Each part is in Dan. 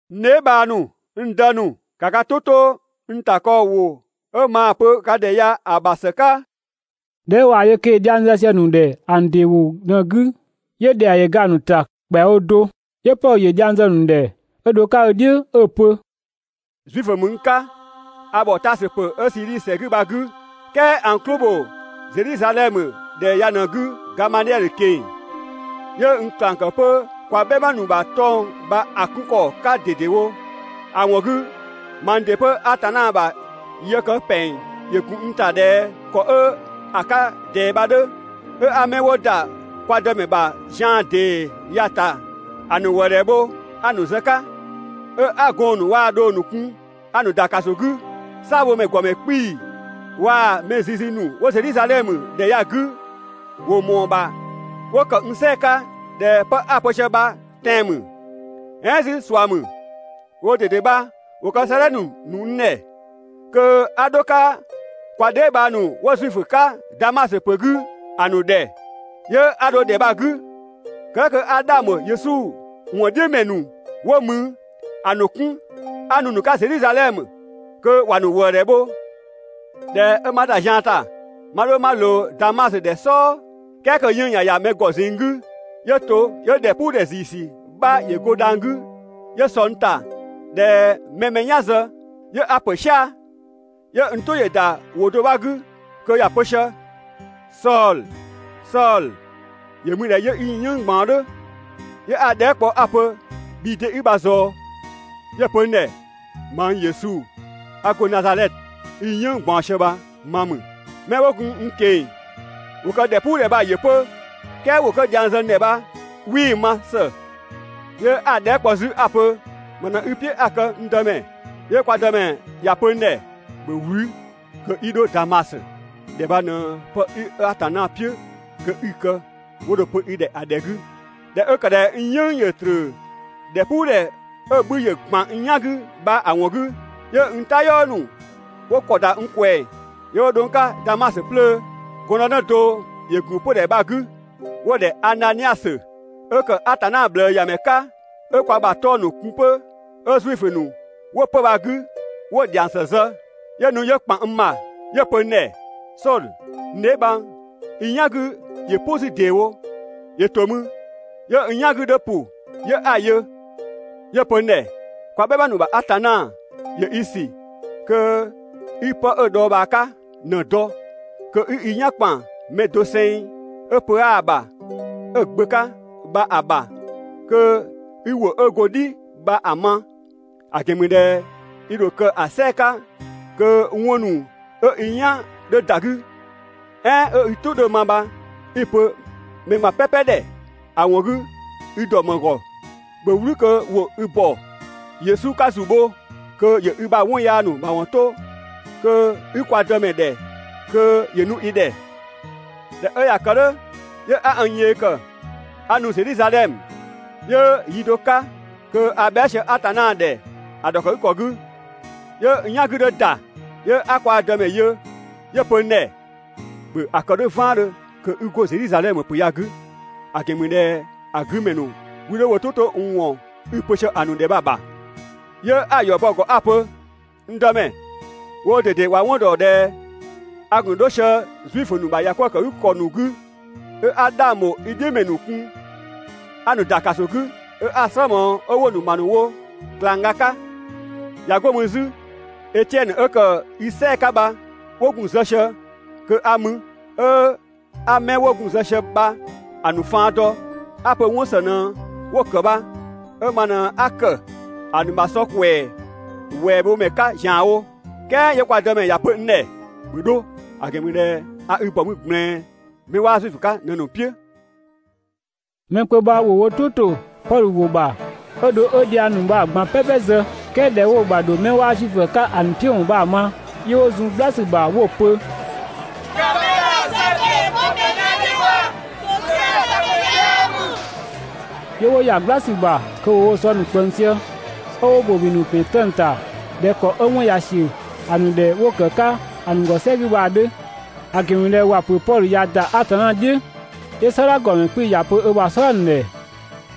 «N dheebhang ‑nu, n dë ‑nu, ‑ka ka "tʋ 'to n ‑takɔɔwʋ 'ö maa‑ pö ka ‑dhɛ ya‑ ‑bha ‑së 'ka!» ꞊Dhɛ 'ö ꞊waa‑ yö kö ‑yö dhiang zë sië‑ ‑nu ‑dhɛ ‑a ‑nu ‑dɩ ‑wʋ ꞊në‑ 'gü, 'yö ‑dhɛa ‑yö ‑ga ‑a ‑nu ‑ta ‑kpɛawo do. 'Yö Pɔdhö ‑yö dhiang zë‑ ‑nu ‑dhɛ 'ö dho‑ 'ka "dhiʋ̈ 'ö‑ pö: «Zuifö ‑mü n 'ka, a ‑bhɔ Taasö ‑pö 'ö Sidhisi ‑sɛ 'gü bha‑ 'gü, "kɛɛ a n "klʋ ‑bho Zedhizadhɛmö ‑dhɛ ya ꞊në‑ 'gü Gamadhiɛdhö ꞊keng‑. ‑Yö n ꞊klang ‑kë 'pö kwa "bhɛma ‑nu ‑bha 'tɔng‑ bha‑ 'kun ‑kɔ 'ka ꞊dedewo. ‑A ‑wɔn 'gü mang ‑dɩ 'pö Atanna ‑bha yë kë ‑pɛng ‑yö ‑gun n ‑ta ꞊dhɛ ‑kɔ 'ö 'ka‑ 'ka ꞊dɛɛ bha‑ 'dhö. 'Ö 'a 'mɛ 'wo ‑da kwa Dëmɛ ‑bha zian ‑dee ya‑ ‑ta, ‑a ‑nu ‑wëëdhɛ bho 'a‑ ‑nu zë‑ 'ka, 'ö 'a gɔɔn‑ ‑nu waa‑ dhong ‑nu kun 'a‑ ‑nu ‑da ‑kaso 'gü. "Saabhomɛ ‑gɔmɛ 'kpii‑ waa‑ mɛ zizi ‑nu 'wo Zedhizadhɛmö ‑dhɛ ya‑ 'gü ‑wo ‑mɔɔ ‑bha 'wo ‑kë n "sɛɛ‑ 'ka ꞊dhɛ 'pë 'a‑ pö sië bha tɛan‑ ‑mü, "ɛɛn 'zü ꞊sua ‑mü. Woo ꞊dede bha ‑wo kë 'sëëdhɛ ‑nu ‑nu n ‑dhɛ kö 'a dho‑ 'ka kwa dheebhang ‑nu 'wo Zuifö 'ka Damasö ‑pö 'gü ‑a ‑nu ‑dhɛ, 'yö 'a dho ‑dhɛ bha‑ 'gü kë "dhʋ̈ kö 'a 'dhang ‑bho Yesu ‑wɔn "dhiʋ̈ ‑mɛ ‑nu 'wo mü ‑a ‑nu 'kun 'a nu‑ ‑nu 'ka Zedhizadhɛmö kö ‑wa ‑nu ‑wëëdhɛ bho. ꞊Dhɛ 'ö 'ma ‑da zian ‑ta 'ma 'dho 'ma ꞊loo Damasö ‑dhɛ "sɔɔ, "kɛɛ kö 'yënng‑ ꞊ya ‑ya mɛ ‑gɔ ꞊zinng 'gü, 'yö to 'yö ‑dhɛpuudhɛ ‑ziisü 'bha ‑yö go 'dhang 'gü 'yö sɔ n ‑ta ꞊dhɛ mɛ mɛ‑ mɛ "yan zë, 'yö 'a ‑pö "sia‑, 'yö n "tʋ ‑yö ‑da ‑wʋ do 'gü kö ‑ya pö sië: «Sɔdhö, Sɔdhö, ‑yö mü ꞊dhɛ 'yö 'i n "yënng ꞊gbaɔn "dhʋ̈?» 'Yö 'a‑ dhɛɛ" kpɔ 'a‑ pö: «Bhii 'de 'i bha ꞊zɔɔ?» 'Yö‑ pö n ‑dhɛ: «Mang Yesu 'a go Nazadhɛtö i‑ "yënng ꞊gbaɔn sië bha ma ‑mü.» 'Mɛ 'wo gun n ꞊keng‑ ‑wo kë ‑dhɛpuudhɛ bha‑ yö 'pö, "kɛɛ ‑wʋ 'kö dhiang zë n ‑dhɛ bha 'wii‑ ma ‑së. 'Yö 'a‑ dhɛɛ" kpɔ 'zü 'a‑ pö: «‑Më ꞊në 'i‑ "piʋ̈ 'a‑ kë, n Dëmɛ?» 'Yö kwa Dëmɛ ‑ya pö n ‑dhɛ: «‑Bhö "wlü kö 'i 'dho Damasö! ‑Dhɛ bha ꞊në 'pë 'ö Atanna "piʋ̈ kö 'i‑ kë 'wo dho‑ pö i ‑dhɛ ‑a ‑dhɛ 'gü.» ꞊Dhɛ 'ö ‑kë ꞊dhɛ n "yënng ‑yö ꞊tröö ‑dhɛpuudhɛ 'ö‑ 'bhü ‑yö ‑gban n "yan 'gü bha‑ ‑wɔn 'gü, 'yö n "tayɔɔ ‑nu 'wo ‑kɔ ‑da n ꞊kwɛɛ‑ 'yö 'wo dho n 'ka Damasö 'plöö. Gɔndënë do ‑yö ‑gun 'pödhɛ bha‑ 'gü 'wo‑ ‑dhɛ Ananiasö 'ö ‑kë Atanna ꞊bhlëëyamɛ 'ka 'ö kwa ‑bha 'tɔng‑ ‑nu kun 'pö, 'ö Zuifö ‑nu 'wo 'pö‑ bha‑ 'gü 'wo‑ ‑dhiang ‑së zë. 'Yö nu 'yö ‑kpan n ‑bha 'yö‑ pö n ‑dhɛ: «Sɔdhö, n dheebhang, i "yan 'gü ‑yö "pʋ 'zü ‑deewo!» 'Yö to mü 'yö n "yan 'gü 'dhö ‑pʋ 'yö 'a‑ yö. 'Yö‑ pö n ‑dhɛ: «Kwa "bhɛma ‑nu ‑bha Atanna ‑yö i ‑sü kö 'i 'pë 'ö‑ dhɔɔbhaa 'ka ꞊në‑ dɔ, kö 'i i "yan ‑kpan mɛ doseng 'ö pö 'aa‑ ‑bha ('ö‑ Gbö 'ka) bha‑ ‑bha kö 'i ‑wʋ 'ö go‑ "dhi bha‑ ma. ‑A ‑gɛn ‑mü ꞊dhɛ i ‑dho kë ‑a "sɛɛ‑ 'ka kö 'wɔn ‑nu 'ö i "yan 'dhö ‑da 'gü, "ɛɛn 'ö i "tʋ 'dhö‑ ma bha 'i‑ pö mɛ ꞊gban "pɛpɛ ‑dhɛ. ‑A ‑wɔn 'gü i ‑dɔ ‑më ‑gɔ? ‑Bhö "wlü kö ‑wo i ‑bɔ Yesu 'ka ‑zu bho kö ‑yö i ‑bha 'wɔn yaa ‑nu ‑mawɔn 'to kö 'i kwa Dëmɛ ‑dhɛ kö ‑yö nu i ‑dhɛ. ꞊Dhɛ 'ö ꞊ya kë "dhʋ̈, 'yö 'a n yee ‑kë 'a nu Zedhizadhɛmö. 'Yö yi do 'ka kö a bhɛa" sië Atanna ‑dhɛ ‑a ‑dhɔkëgükɔ 'gü, 'yö n "yan 'gü 'dhö ‑da, 'yö 'a kwa Dëmɛ yö, 'yö‑ pö n ‑dhɛ: «‑Bhö ‑a kë "dhʋ̈ "vaandhö kö 'i 'go Zedhizadhɛmö ‑pö ya‑ 'gü, ‑a ‑gɛn ‑mü ꞊dhɛ ‑a 'gü ‑mɛ ‑nu 'wii 'dho wo "tʋ 'to n ‑wɔn 'i‑ pö sië‑ ‑nu ‑dhɛ bha‑ ‑bha.» 'Yö 'a‑ ‑yɔ bɔ‑ ‑gɔ 'a‑ pö: «N Dëmɛ, woo ꞊dede ‑wa dɔ ꞊dhɛ a gun 'dho sië Zuifö ‑nu ‑bha ‑yakwëëkëgükɔ ‑nu 'gü, 'ö 'a 'dhang ‑bho i "dhiʋ̈ ‑mɛ ‑nu kun 'a‑ ‑nu ‑da ‑kaso 'gü, 'ö 'a‑ "slë ꞊mɔɔ 'ö 'wo‑ ‑nu ‑ma ‑nu wo ꞊klangga 'ka. ꞊Ya 'go mü 'zü Etiɛnö 'ö ‑kë i "sɛɛ‑ 'ka bha 'wo gun‑ zë sië kö a mü, 'ö 'a 'mɛ 'wo gun‑ zë sië bha‑ ‑nu faan dɔ, 'a‑ pö 'wɔn ‑së ꞊në 'wo‑ ‑kë bha, 'ö ma ꞊në 'a ‑kë ‑a ‑nu ‑bha sɔ ‑kwɛɛ ‑wɛɛ bho ‑mɛ 'ka ‑zianwo. "Kɛɛ 'yö kwa Dëmɛ ‑ya pö n ‑dhɛ: ‹‑Bhö 'dho, ‑a ‑gɛn ‑mü ꞊dhɛ a i ‑bɔ mü ꞊gblɛɛn 'mɛ 'waa Zuifö 'ka ꞊në‑ ‑nu "piʋ̈.› Mɛ kpö bha ‑wo wo "tʋ ‑to Pɔdhö ‑wʋ ‑bha 'ö dho 'ö dhiang ‑nu bha‑ ꞊gban "pɛpɛ zë, "kɛɛ ꞊dhɛ 'wo‑ ‑bha ‑dho 'mɛ 'waa Zuifö 'ka‑ ‑nu "piʋ̈ ‑wɔn bha‑ ma, 'yö 'wo zun "gbla ‑sü ‑bha 'wo‑ pö: «‑Ka mɛ bha‑ zë kö ‑yö 'go mɛ "yan "dhiʋ̈ bha. ‑Tosɛa këmɛ 'yaa ‑mü!» 'Yö 'wo ‑ya "gbla ‑sü ‑bha kö ‑wo woo‑ ‑bha sɔ ‑nu ꞊kpëng 'ö ‑wo ‑bobi ‑nu ‑pɛn 'tëng‑ ‑ta ꞊dhɛ ‑kɔ 'ö 'mɛ 'wɔn ꞊ya ‑siö ‑a ‑nu ‑dhɛ 'wo‑ ‑kë 'ka ‑a ‑nu ‑gɔ "sɛ 'gü bha‑ 'dhö, (‑a ‑gɛn ‑mü ꞊dhɛ ‑wa ‑pö Pɔdhö ꞊ya ‑da Atanna "dhiʋ̈). 'Yö "sɔdha ‑gɔmɛ 'kpii‑ ‑ya pö ö ‑bha "sɔdha ‑nu ‑dhɛ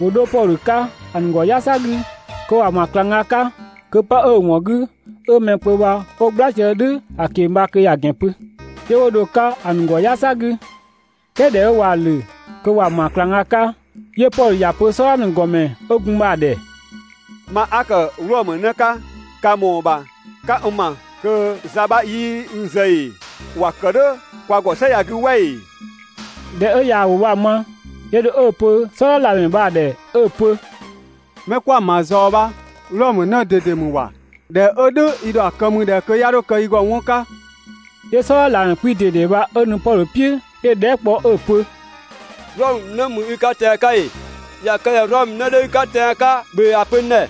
‑wo 'dho Pɔdhö 'ka ‑a ‑nu ‑gɔ "yasa 'gü kö ‑wa ‑ma ꞊klangga 'ka kö 'pë 'ö‑ ‑wɔn 'gü 'ö mɛ kpö bha 'wo "gbla sië "dhʋ̈ ‑a ꞊keng‑ bha kö ‑ya ‑gɛn pö, 'yö 'wo dho‑ 'ka ‑a ‑nu ‑gɔ "yasa 'gü. "Kɛɛ ꞊dhɛ 'ö ꞊waa‑ ‑lö kö ‑wa ‑ma ꞊klangga 'ka, 'yö Pɔdhö ‑ya pö "sɔdha ‑nu ‑gɔmɛ 'ö gun mü bha‑ ‑dhɛ: «Ma 'a ‑kë Wlɔmö 'në 'ka ka ‑mɔɔ ‑bha 'ka n ‑ma kö za 'bha 'yii n zë ‑ee? ‑Wa ‑kë "dhʋ̈ kwa ‑gɔ "sɛ ya‑ 'gü "wɛ ‑ee?» ꞊Dhɛ 'ö ꞊yaa‑ ‑wʋ bha‑ ma, 'yö dho 'ö‑ pö "sɔdha ꞊lamɛ bha‑ ꞊dhɛ 'ö‑ pö: «'Mɛ kwaa‑ ‑ma bha ꞊zɔɔ bha Wlɔmö 'në ꞊dede ‑mü ‑wa! ꞊Dhɛ 'ö "dhʋ̈ i ‑dho ‑a kë ‑mü ꞊dhɛ kö 'ya 'dho kë i ‑gɔ 'wɔn 'ka?» 'Yö "sɔdha ꞊lamɛ 'kpii‑ ꞊dede bha 'ö nu Pɔdhö "piʋ̈ 'yö‑ dhɛɛ" kpɔ 'ö‑ pö: «Wlɔmö 'në ‑mü i 'ka tɛan‑ 'ka ‑ee? ꞊Ya kë ꞊dhɛ Wlɔmö 'në 'dhö i 'ka tɛan‑ 'ka ‑bhö ‑a pö n ‑dhɛ.»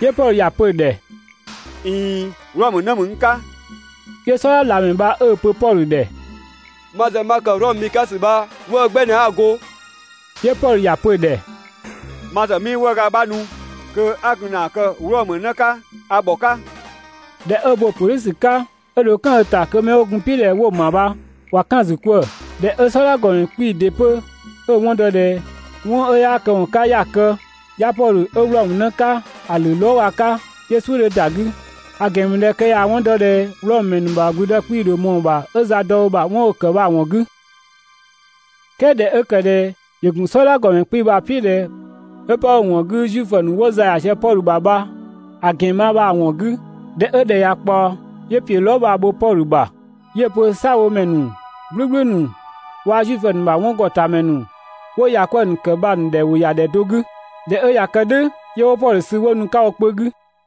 'Yö Pɔdhö ‑ya pö‑ ‑dhɛ: «꞊Iin, Wlɔmö 'në ‑mü n 'ka.» 'Yö "sɔdha ꞊lamɛ bha 'ö‑ pö Pɔdhö ‑dhɛ: «Ma ‑zë ma ‑kë Wlɔmö mi 'ka ‑sü bha 'wëë‑ 'gbɛ ꞊në 'a‑ go. 'Yö Pɔdhö ‑ya pö‑ ‑dhɛ: «Ma ‑zë 'mii 'wëëga 'bha nu kö 'a gun ‑na kë Wlɔmö 'në 'ka, a ‑bhɔ 'ka.» ꞊Dhɛ 'ö bo‑ pö "dhʋ̈ ‑sü 'ka, 'ö dho "kan ö ‑ta kö 'mɛ 'wo gun‑ "piʋ̈ ꞊dhɛ 'wo‑ ‑ma bha ꞊wa "kan‑ ‑zü 'kwëë‑. ꞊Dhɛ 'ö "sɔdha ‑gɔmɛ 'kpii‑ ‑dɩ 'pö 'ö‑ 'wɔn dɔ ꞊dhɛ 'wɔn 'ö 'yaa këwɔn 'ka 'ya‑ kë, 'ya Pɔdhö 'ö Wlɔmö 'në 'ka ‑a ‑lö lɔɔga 'ka, 'yö "suʋ̈ 'dhö ‑da 'gü, (‑a ‑gɛn ‑mü ꞊dhɛ kö ꞊yaa‑ 'wɔn dɔ ꞊dhɛ Wlɔmö ‑mɛ ‑nu ‑bha ‑gblüdë 'kpii‑ ‑dho ꞊mɔɔ‑ ‑bha 'ö za dɔ ö ‑bha 'wɔn 'ö‑ ‑kë bha‑ ‑wɔn 'gü). "Kɛɛ ꞊dhɛ 'ö ‑kë ꞊dhɛ ‑yö ‑gun "sɔdha ‑gɔmɛ 'kpii‑ bha "piʋ̈ ꞊dhɛ 'ö 'pë 'ö‑ ‑wɔn 'gü Zuifö ‑nu 'wo za ‑ya sië Pɔdhö ‑bha bha‑ ‑gɛn ma bha‑ ‑wɔn 'gü, ꞊dhɛ 'ö ‑dhɛ ꞊ya ꞊kpaɔ, 'yö ‑piö lɔɔ" bha bho Pɔdhö ‑bha, 'yö‑ pö "saabhomɛ ‑nu "gblʋ̈gblʋ̈ ‑nu waa‑ Zuifö ‑nu ‑bha 'wɔngɔtamɛ ‑nu 'wo ‑ya 'kwëë‑ ‑nu ‑kë bha‑ ‑nu ‑dhɛ ‑wo ‑ya ‑dhɛ do 'gü. ꞊Dhɛ 'ö ꞊ya kë "dhʋ̈ 'yö 'wo Pɔdhö sü 'wo nu‑ 'ka wo kpö 'gü.